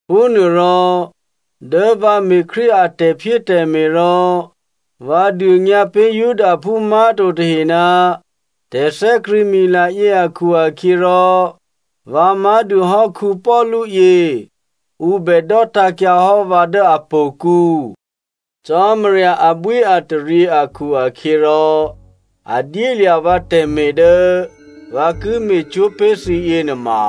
Phúnuôrò, dố vǎ me̤ Krístu a tè̤phyétè̤me̤ rò vǎ dônyǎ pé̤ Judaphú má̤to tahe ná tè̤thè́krṳ̂̌mila yě akhu-akhyěrò, vǎ má̤dû hò́ Paulu yě, ǔ bè dò́tǎ̤kyǎ hò́ vǎ dố htò̌kǔ. Cò́marya abwíataryě akhu-akhyěrò, a dyélya̤ vǎ tè̤me̤ dố vǎ ki me̤cwó̤ pé̤ thǐ yěnuôma,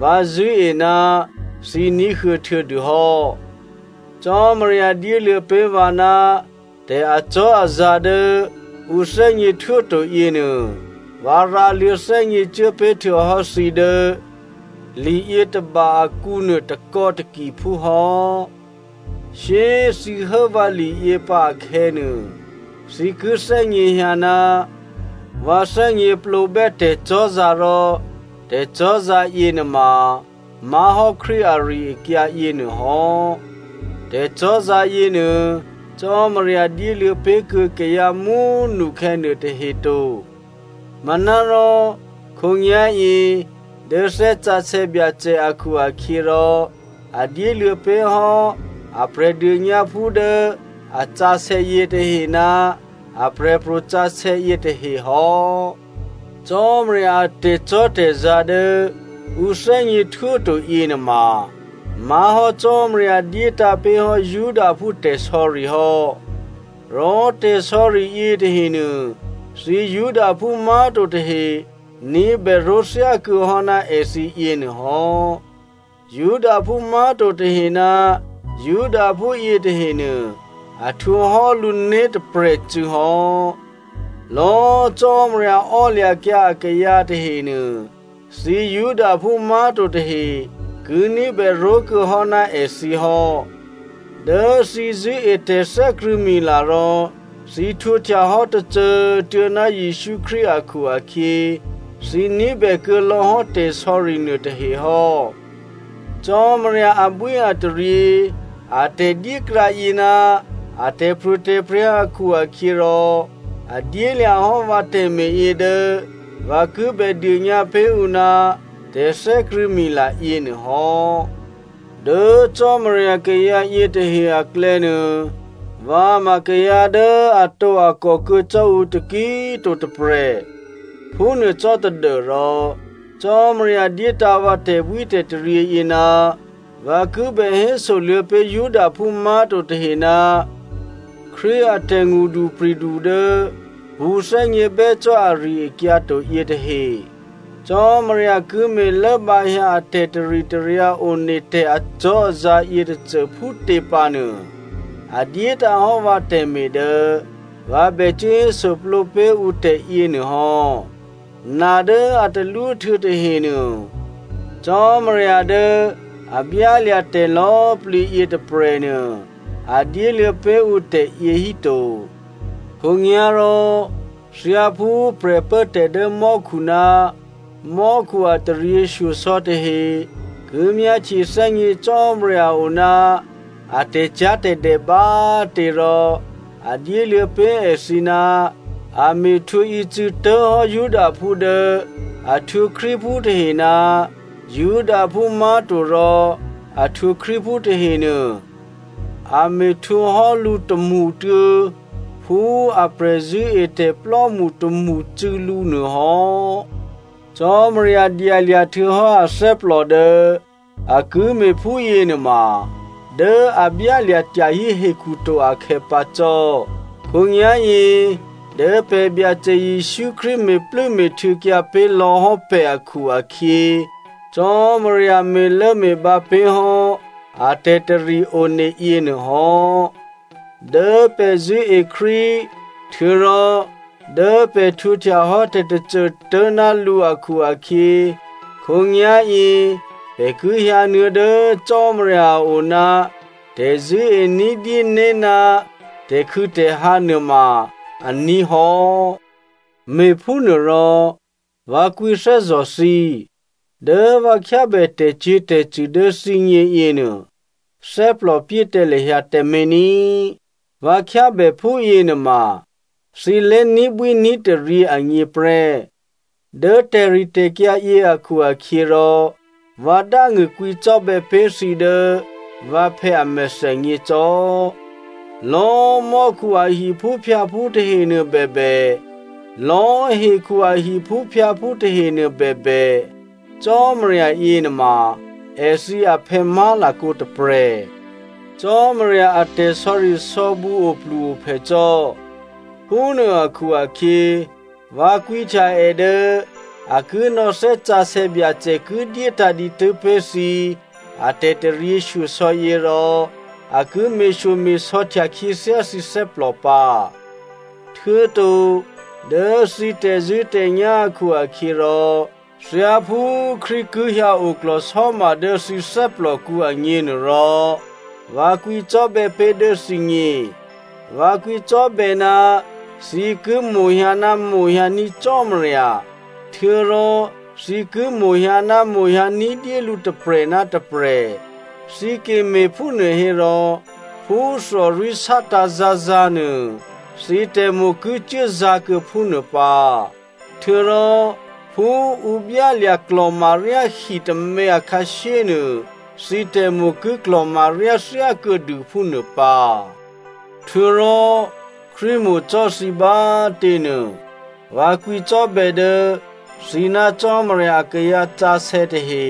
vǎ zṳ̂́e ná thǐ ní̤huô̌ htuô̌dûhò́. Cò́marya dyéluô̌ pé̤ vǎ ná tè̤acò́azǎ̤ dố ǔ thè́gněhtwó to yěnuô, vǎ rǎluô̌ thè́gněcuố pé̤ htuô̌hò́ thǐ dố liyětôba akǔnuô takò̌takiphú hò́. Shyé꤮ thǐ hố vǎliyě pǎ akhè̌nuô, thǐ ki thè́gněhyǎ ná vǎ thè́gněplǒbè́ tè̤cò́zǎ̤ rò tè̤cò́zǎ̤ yěnuôma má̤hò́ Krístu ari-akyǎ yěnuô hò́. Tè̤cò́zǎ̤ yěnuô, Cò́marya dyéluô̌ pé̤kuô̌ kayǎ mú꤮ nukhè̌ nuôtahe to. Manárò khǒnyá̤yě dố Thè́ Sǎsè̌ Byacè akhu-akhyěrò a dyéluô̌ pé̤ hò́ a Prè̤dônyǎphú dố a sǎsè̌ yětahe ná aprè̤pro̤ sǎsè̌ yětahe hò́. Cò́marya a tè̤cò́tè̤zǎ̤ dố ǔ thè́gněhtwó to yěnuôma má̤hò́ Cò́marya dyétǎ̤ pé̤hò́ Judaphú tè̤sò̌ri hò́. Rò tè̤sò̌ri yětahenuô, thǐ Judaphú má̤to tahe ní̤bè ró̤thyákuô̌hò́ ná èthǐ yěnuôhò́. Judaphú má̤to tahe ná Judaphú yětahenuô, a htwǒhò́ lǔ né̤ tôprè̤cû̌ hò́. Lò̌꤮ Cò́marya ò́lya̤kyǎ akayǎ tahenuô, thǐ Judaphú má̤to tahe ki ní̤bè ró̤kuô̌hò́ ná èthǐ hò́. Dố thǐ zṳ̂́e tè̤thè́krṳ̂̌mila rò thǐ htwǒhtyahò́ tôcô꤮ tuô̌ ná Jesǔ Krístu akhu-akhyě, thǐ ní̤bèkuô̌ lò̌hò́ tè̤sò̌ri nuôtahe hò́. Cò́marya abwíataryě a tè̤dyékrǎ yě ná a tè̤pro̤tè̤prya̤ akhu-akhyěrò a dyélya̤ hò́ vǎ tè̤me̤yě dố vǎ ki bè dônyǎ pé̤ ǔ ná tè̤thè́krṳ̂̌mila yěnuô hò́. Dố Cò́marya kayǎ yětahe aklè̌nuô, vǎ ma kayǎ dố atǒakò kuô̌ cò́ ǔ taki꤮ to tôprè̤. Phúnuô cò́ tadû́rò Cò́marya dyétǎ̤ vǎ tè̤bwítè̤taryě yě ná vǎ ki bè hésoluô̌ pé̤ Judaphú má̤to tahe ná Krístu a tè̤ngṳdupri̤du dố pṳ̌thè́gně bè́ cò́ ari-akyǎ to yětahe. Cò́marya ki me̤lốbǎhyǎ a tè̤taritaryǎ one tè̤ acò́azǎ̤ yětôcô phútě pǎnuô, a dyétǎ̤hò́ vǎ tè̤me̤ dố vǎ bè cuố hésoplǒ pé̤ ǔ tè̤yěnuô hò́. Na dố a talwó htuô̌tahe nuô, Cò́marya dố a byálya̤ tè̤ lò̌꤮ plǐ yětôprè̤nuô, a dyéluô̌ pé̤ ǔ tè̤yě híto. Khǒnyá̤rò thyáphú prè̤pốtè̤ dố mò́khu ná mò́khu a taryěshyosò̌ tahe ki myáhtye thè́gně Cò́marya oná a tè̤cyá̤tè̤dè bá꤮ tě, rò a dyéluô̌ pé̤ èthǐ ná a me̤htwǒ ícû̌ tố̤hò́ Judaphú dố a htwǒ Krístuphú tahe ná Judaphú má̤to rò a htwǒ Krístuphú tahenuô a me̤htwǒhò́ lǔ tômṳtuô̌ phú a prè̤zṳ̂́etè̤plò́mṳ tômṳcû̌lǔ nuôhò́. Cò́marya dyalya̤ htuô̌hò́ athè́plò dố a ki me̤ phúyě nuôma dố a byálya̤ tyahí hekhuto akhè̌ pǎ cò́. Khǒnyá̤yě dố pè̤ Byacè Jesǔ Krístu me̤plû́me̤htuô̌kyǎ pé̤ lò̌hò́ pè̤ akhu-akhyě, Cò́marya me̤lốme̤bǎ pé̤hò́ a tè̤tari one yěnuôhò́. Dố pè̤ zṳ̂́e Krístu, htuô̌rò dố pè̤ htwǒhtyahò́ tè̤tôcô tố̤ ná lǔ akhu-akhyě, khǒnyá̤yě pè̤ ki hyǎnuô̌ dố Cò́marya a o ná tè̤zṳ̂́e ní̤dyéné̤ ná tè̤khû̌tè̤hǎ nuôma aní̤ hò́. Me̤phúnuôrò, vǎ kwǐthè́zò̤ thǐ, dố vǎ khyábè tè̤cyě̤tè̤cṳ̂ dố thǐgně yěnuô, thè́plòpyé tǎ lahyǎ tǎmé̤ ní꤮. Vǎ khyábè phúyě nuôma thǐ lé̤ní̤bwí ní̤taryě agněprè́. Dố tè̤ritè̤kyǎ yě akhu-akhyěrò, vǎ dángṳ̂ kwǐcò́bè̌ pé̤ thǐ dố vǎphè̌ a mèthènyě cò́. Lò̌꤮ mò́khu a hiphúphyǎphú tahenuô bèbè, lò̌꤮ hekhu a hiphúphyǎphú tahenuô bèbè, Cò́marya yěnuôma èthǐ aphè̌ má̤lakǒ tôprè̤. Cò́marya a tè̤sò̌risò̌bǔ oplu-ophè cò́. Phúnuô akhu-akhyě, vǎ kwǐhtya è dố a ki nò̌ Thè́ Sǎsè̌ Byacè ki dyétǎ̤ dǐtû́ pé̤ thǐ atè̤taryěshyosò̌ yě rò a ki me̤shyome̤sò̌htya khyěthyá thǐ thè́plò pǎ. Htuô̌to dố thǐ tè̤zṳ̂́tè̤nyá̤ akhu-akhyěrò, thyáphú Krístu ki hyǎ oklò̤sò́ma dố thǐ thè́plòkǔ agněnuôrò, vǎ kwǐcò́bè̌ pé̤ dố thǐgně. Vǎ kwǐcò́bè̌ ná thǐ ki mo̤hyǎ ná mo̤hyǎ ní̤ Cò́marya, htuô̌rò thǐ ki mo̤hyǎ ná mo̤hyǎ ní̤dyé lǔ tôprè̤ ná tôprè̤. Thǐ ki me̤phúnuô hérò phú thòrwí̤ sátǎ̤zǎ̤zǎ̤ nuô, thǐ tè̤mo̤ ki cuốzǎ̤kuô̌ phúnuô pǎ, htuô̌rò phú ǔ byálya̤ klò̤maryá hi tômě akhǎshyénuô, thǐ tè̤mo̤ ki klò̤maryá thyákuô̌dû phúnuô pǎ. Htuô̌rò Krístu mo̤ cò́ thǐ bá꤮ těnuô, vǎ kwǐcò́bè̌ dố thǐ ná Cò́marya akayǎ sǎsè̌ tahe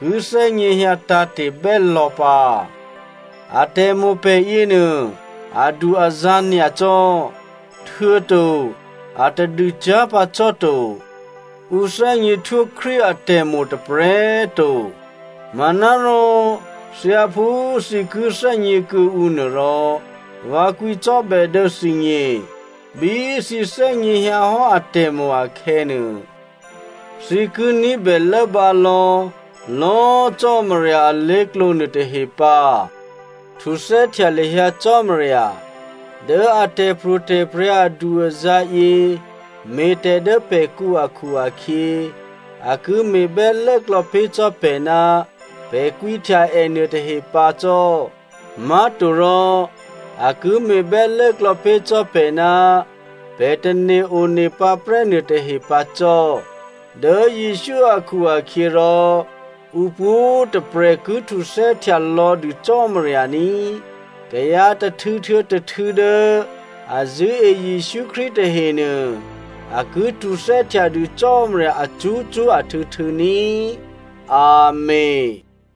ki thè́gněhyǎ tǎ̤te̤ bè́lò̌ pǎ. Atè̤mo̤ pè̤ yěnuô adu-azǎ̤ nyacò́, htuô̌to a tadûcyá̤ pǎ cò́ to. Ǔ thè́gněhtwó Krístu atè̤mo̤ tôprè̤꤮ to manárò thyáphú thǐ ki thè́gně kuô̌ǔ nuôrò, vǎ kwǐcò́bè̌ dố thǐgně. Bí thǐ thè́gněhyǎhò́ atè̤mo̤ akhè̌nuô, thǐ ki ní̤bè lốbǎ lò̌lò̌꤮ Cò́marya alé̤klǒ nuôtahe pǎ. Htuthè́htya lahyǎ Cò́marya. Dố a tè̤pro̤tè̤prya̤ adu-azǎ̤ yě me̤tè̤ dố pè̤kǔ akhu-akhyě, a ki me̤bè́ lốklò̌ pé̤ cò́ pè̤ ná pè̤ kwǐhtya è nuôtahe pǎ cò́. Má̤torò, a ki me̤bè́ lốklò̌ pé̤ cò́ pè̤ ná pè̤ tane̤ onepǎ prè́ nuôtahe pǎ cò́. Dố Jesǔ akhu-akhyěrò ǔpwǒ̤꤮ tôprè̤ ki htuthè́htya lò̌dû Cò́marya ní꤮. Kayǎ tôhtû̌ htuô̌ tôhtû̌ dố a zṳ̂́e Jesǔ Krístu tahenuô, a ki htuthè́htya dû Cò́marya acṳ́cṳ́ ahtû̌htû̌ ní꤮. Amèn.